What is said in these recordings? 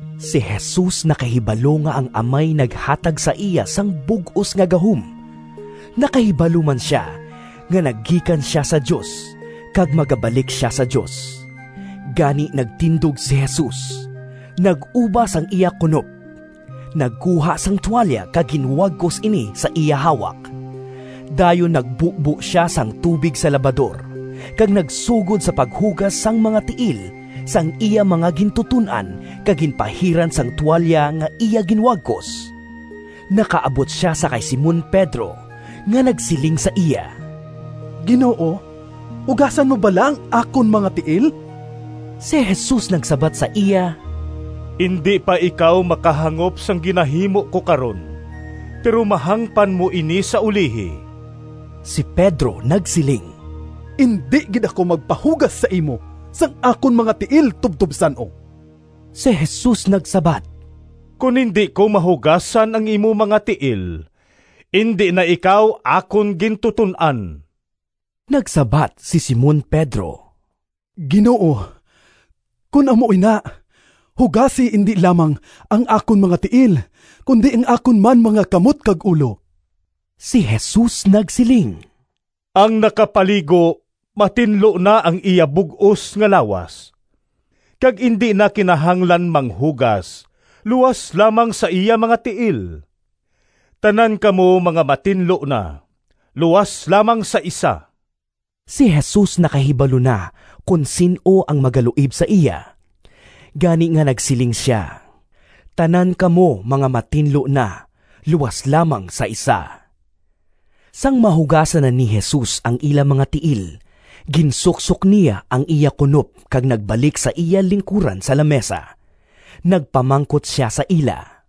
Si Jesus nakahibalo nga ang Amay naghatag sa iya sang bug-os nga gahom. Nakahibalo man sia nga nagikan sia sa Dios kag magabalik sia sa Dios. Gani nagtindog si Jesus, nag-uba sang iya kunop, nagkuha sang tualya kag ginwagkos ini sa iya hawak. Dayon nagbubo sia sang tubig sa labador, kag nagsugod sa paghugas sang mga tiil sang iya mga gintuton-an kag ginpahiran sang tualya nga iya ginwagkos. Nakaabot sia sa kay Simon Pedro nga nagsiling sa iya, “Ginoo, hugasan mo bala ang akon mga tiil?” Si Jesus nagsabat sa iya, “Indi pa ikaw makahangop sang ginahimo ko karon, pero mahangpan mo ini sa ulihi.” Si Pedro nagsiling, “Indi gid ako magpahugas sa imo sang akon mga tiil tubtob san-o!” Si Jesus nagsabat, “Kon indi ko mahugasan ang imo mga tiil, indi na ikaw akon gintuton-an.” Nagsabat si Simon Pedro, “Ginoo, kon amo ina, hugasi indi lamang ang akon mga tiil, kundi ang akon man mga kamot kag ulo!” Si Jesus nagsiling, “Ang nakapaligo matinlo na ang iya bug-os nga lawas, kag indi na kinahanglan manghugas luas lamang sa iya mga tiil. Tanan kamo mga matinlo na luas lamang sa isa.” (Si Jesus nakahibalo na kon sin-o ang magaluib sa iya. Gani nga nagsiling sia, “Tanan kamo mga matinlo na luas lamang sa isa.”) Sang mahugasan na ni Jesus ang ila mga tiil, ginsuksok niya ang iya kunop kag nagbalik sa iya lingkuran sa lamisa. Nagpamangkot sia sa ila,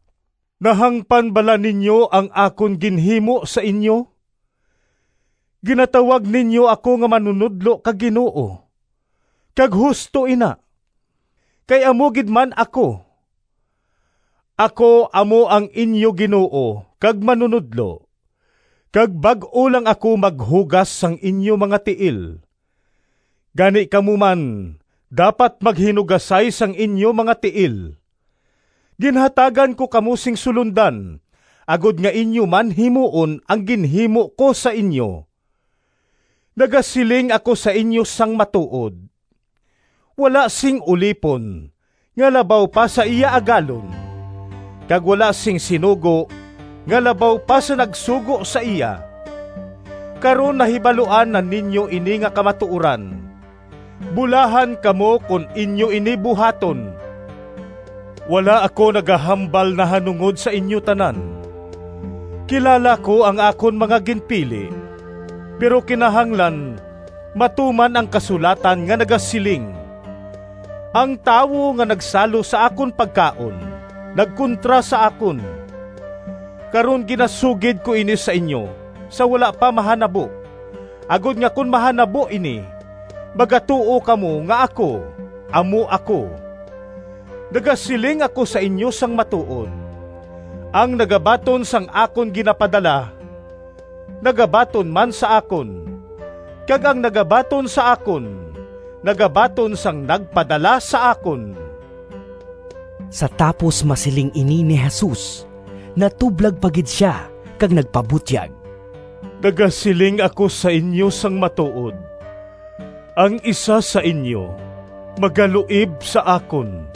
“Nahangpan bala ninyo ang akon ginhimo sa inyo? Ginatawag ninyo ako nga Manunodlo kag Ginoo, kag husto ina, kay amo gid man ako. Ako amo ang inyo Ginoo kag Manunodlo, kag bag-o lang ako maghugas sang inyo mga tiil. Gani kamo man dapat maghinugasay sang inyo mga tiil. Ginhatagan ko kamo sing sulondan, agod nga inyo man himuon ang ginhimo ko sa inyo. Nagasiling ako sa inyo sang matuod: wala sing ulipon nga labaw pa sa iya agalon, kag wala sing sinugo nga labaw pa sa nagsugo sa iya. Karon nahibaluan na ninyo ini nga kamatuoran. Bulahan kamo kon inyo ini buhaton! “Wala ako nagahambal nahanungod sa inyo tanan. Kilala ko ang akon mga ginpili. Pero kinahanglan matuman ang kasulatan nga nagasiling, ‘Ang tawo nga nagsalo sa akon pagkaon, nagkontra sa akon.’ Karon ginasugid ko ini sa inyo sa wala pa mahanabo, agod nga kon mahanabo ini, magatuo kamo nga ‘Ako Amo Ako’. Nagasiling ako sa inyo sang matuod: ang nagabaton sang akon ginapadala, nagabaton man sa akon, kag ang nagabaton sa akon, nagabaton sang nagpadala sa akon.” Sa tapos masiling ini ni Jesus, natublag pa gid sia kag nagpabutyag, “Nagasiling ako sa inyo sang matuod: ang isa sa inyo magaluib sa akon.”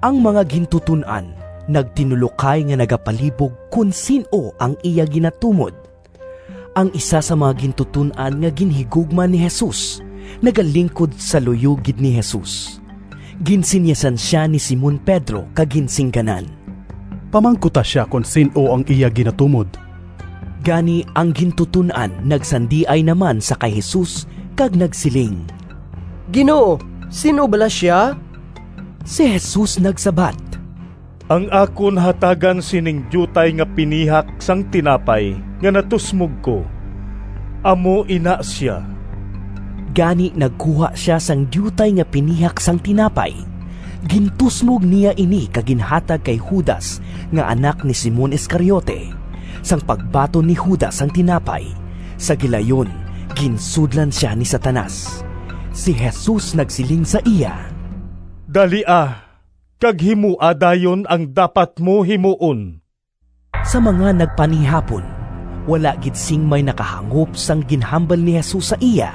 Ang mga gintuton-an nagtinulokay nga nagapalibog kon sin-o ang iya ginatumod. Ang isa sang mga gintuton-an nga ginhigugma ni Jesus, nagalingkod sa luyo gid ni Jesus. Ginsinyasan sia ni Simon Pedro kag ginsingganan, “Pamangkuta sia kon sin-o ang iya ginatumod.” Gani ang gintuton-an nagsandiay naman sa kay Jesus kag nagsiling, “Ginoo, sin-o bala sia?” Si Jesus nagsabat, “Ang akon hatagan sining diutay nga pinihak sang tinapay nga natusmog ko, amo ina sia.” Gani nagkuha sia sang diutay nga pinihak sang tinapay, gintusmog niya ini kag ginhatag kay Judas nga anak ni Simon Iscariote. Sang pagbaton ni Judas sang tinapay, sa gilayon ginsudlan sia ni Satanas. Si Jesus nagsiling sa iya, “Dalia kag himoa dayon ang dapat mo himuon!” Sa mga nagpanihapon, wala gid sing may nakahangop sang ginhambal ni Jesus sa iya.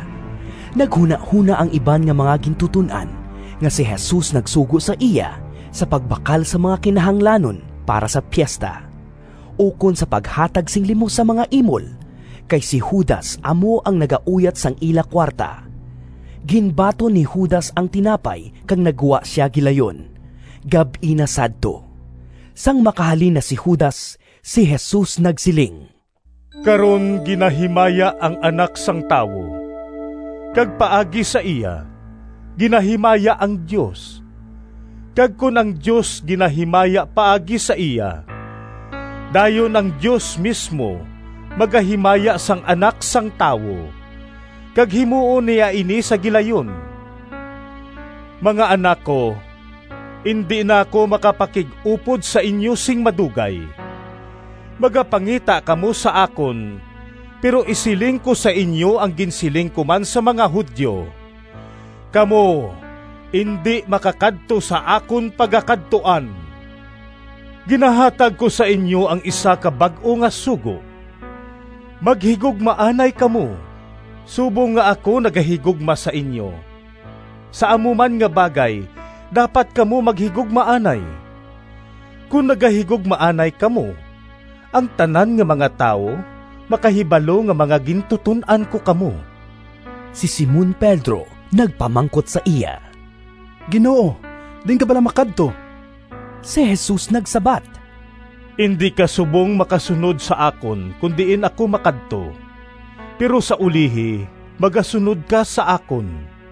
Naghunahona ang iban nga mga gintuton-an nga si Jesus nagsugo sa iya sa pagbakal sang mga kinahanglanon para sa piesta, ukon sa paghatag sing limos sa mga imol, kay si Judas amo ang nagauyat sang ila kuwarta. Ginbaton ni Judas ang tinapay kag naggwa sia gilayon. Gab-i na sadto. Sang makahalin na si Judas, si Jesus nagsiling, “Karon ginahimaya ang Anak sang Tawo, kag paagi sa iya, ginahimaya ang Dios. Kag kon ang Dios ginahimaya paagi sa iya, dayon ang Dios mismo magahimaya sang Anak sang Tawo, kag himuon niya ini sa gilayon. Mga anak ko, indi na ako makapakig-upod sa inyo sing madugay. Magapangita kamo sa akon, pero isiling ko sa inyo ang ginsiling ko man sa mga Judio, ‘Kamo indi makakadto sa akon pagakadtuan.’ Ginahatag ko sa inyo ang isa ka bag-o nga sugo: maghigugmaanay kamo. Subong nga ako nagahigugma sa inyo, sa amo man nga bagay dapat kamo maghigugmaanay. Kon nagahigugmaanay kamo, ang tanan nga mga tawo makahibalo nga mga gintuton-an ko kamo.” Si Simon Pedro nagpamangkot sa iya, “Ginoo, diin ka bala makadto?” Si Jesus nagsabat, “Indi ka subong makasunod sa akon kon diin ako makadto, pero sa ulihi, magasunod ka sa akon.”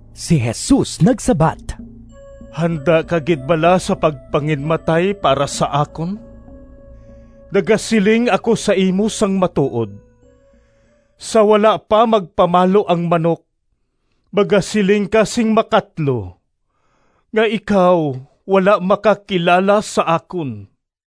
Si Jesus nagsabat, “Handa ka gid bala sa pagpanginmatay para sa akon? Nagasiling ako sa imo sang matuod: sa wala pa magpamalo ang manok, magasiling ka sing makatlo nga ikaw wala makakilala sa akon.”